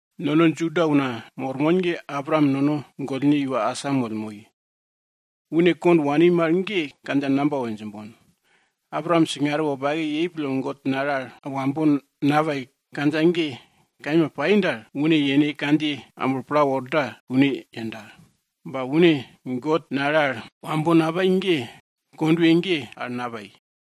Nono Juda una mormon ge Abraam nono gollne iwa asamoll moi. Une kond wani mal ge kandja namba we djimbon? Abraam singare wopake yei pille God nale al wambo napai kandja ge kaima pai dal, une yene kandjiye amblo pla worda kune yenda. Ba une God nale al wambo napai ge kondwe ge al napai.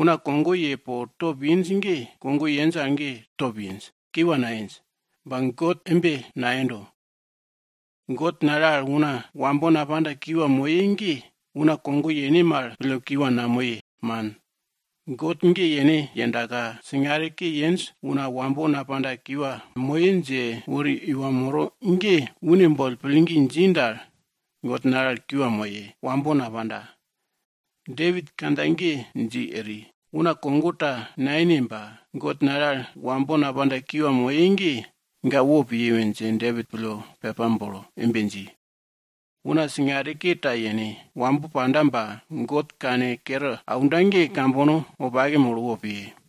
Una kogo ye po top inj ge, kogo yenj al top inj, kiwa nainj. Ba God embe nayendo. God nale al una wambo napanda, kiwa moye ge, una kogo yene mal pille kiwa namoye, man. God ge yene yendaka, singare ke yenj una wambo napanda kiwa moye dje wori iwa moro ge, une boll pillgi dji dal, God nale al kiwa moye, wambo napanda. Depit kandja ge dji eri. Una kogo ta nayene ba, God nale al wambo napanda kiwa moye ge, ga wopiye we dje Depit pille pepa bolo embe dji, Una singare ke ta yene, wambo panda ba God kankere aunda ge kambono wopake molo wopiye.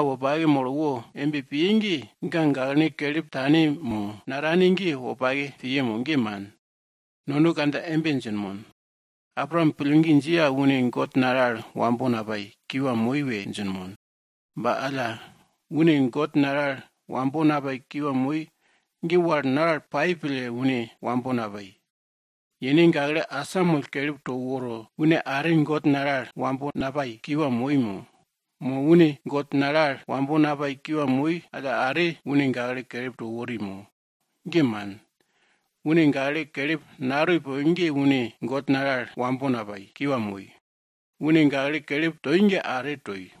Una wopake molo wo embe piye ge, ga gaklene kelip tane mo natane ge wopake piye mo? Ge man, nono kandja embe djinmon, Abraam pillgi dji al une God nale al wambo napai, kiwa moi we djinmon. Ba alla une God nale al wambo napai kiwa moi ge wal naral pai pille une wambo napai? Yene gakle asamoll kelip to woro une are God nale al wambo napai kiwa moi mo? Mo une God nale al wambo napai kiwa moi alla are, une gakle kelip to wori mo? Ge man. Une gakle kelip natoi poke ge une God nale al wambo napai, kiwa moi. Une gakle kelip toi ge are toi.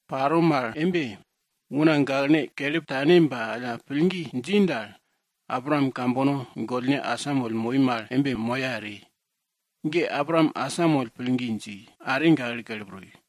Yei mal embe, una gaklene kelip tane ba alla pillgi dji dal, Abraam moro ge une kambono gollne para moya eri. Ge Abraam asamoll pillgi dji, are gakle kelip toi.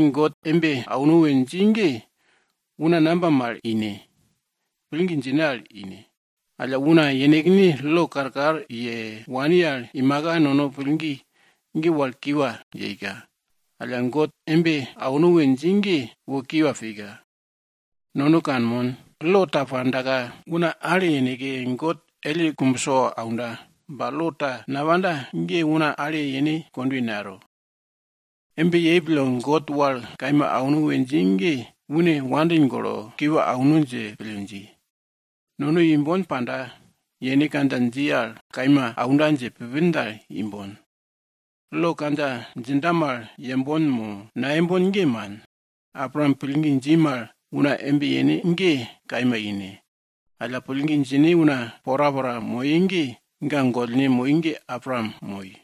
God embe auno we dji ge, una namba mal aunda ine? Ge pillgi djine al ine. Alla una yenekne lo karkar ye wani al imaka, nono pillgi ge wal kiwa yeika. Alla, God embe auno we dji ge, wo kiwa pika. Nono kanmon, lo ta pandaka una ale yeneke, God elle kumbso aunda. Ba lo ta napanda ge, una ale yene kondwe nayero. Embe yei pille God wal kaima auno we dji ge une nono wopake pille kiwa auno dje pille dji. Nono imbon panda, yene kandja dji al nono kaima aunda dje pupin dal, imbon. Lo kandja djinda mal yembon mo nayembon, ge man. Abraam pillgi dji mal una embe yene ge kaima ine. Alla pillgi djine una porapora moye ge, ga gollne moi ge Abraam moi.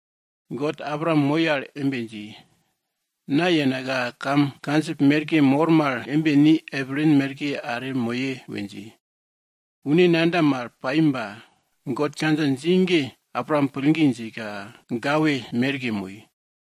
God Abraam moi al embe dji, na yenaka kam kandjip merke moro mal embe ni epilin merke are moye we dji. Kune nayenda mal pai ba God kandja dji ge Abraam pillgi djika gawe merke moi.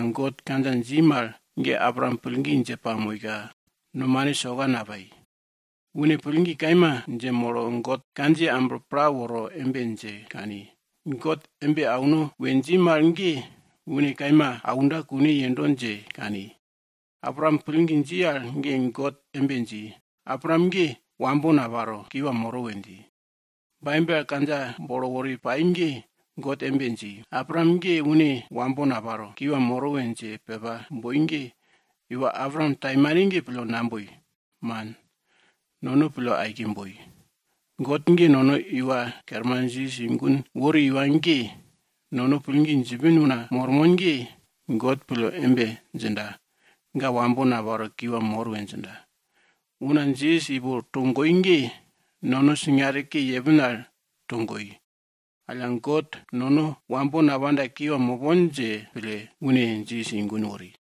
God kandja dji mal ge Abraam pillgi dje pamoika, nomane soka napai. Une pillgi kaima dje molo God kandjiye amblo pla woro embe dje kani, God embe auno we dji mal ge une kaima aunda kune yendo dje kani. Abraam pillgi dji al ge God embe dji, Abraam ge, wambo naparo, kiwa moro we dji. Baibel al kandja bolo wori pai ge, God embe dji, Abraam ge une wambo naparo, kiwa moro we dje pepa boi ge, iwa Abraam taimane ge pille naboi. Man, nono pille aike boi. God ge nono Iwa Kerman Jisas i gun wori iwa ge, nono pillgi djipin una mormon ge, God pille embe djinda, ga wambo naparo, kiwa mor we djinda. Una Jisas ipo togoi ge, nono singare ke yepin al togoi. Alla God, nono wambo napanda kiwa mopon dje pille, une Jisas i gun wori.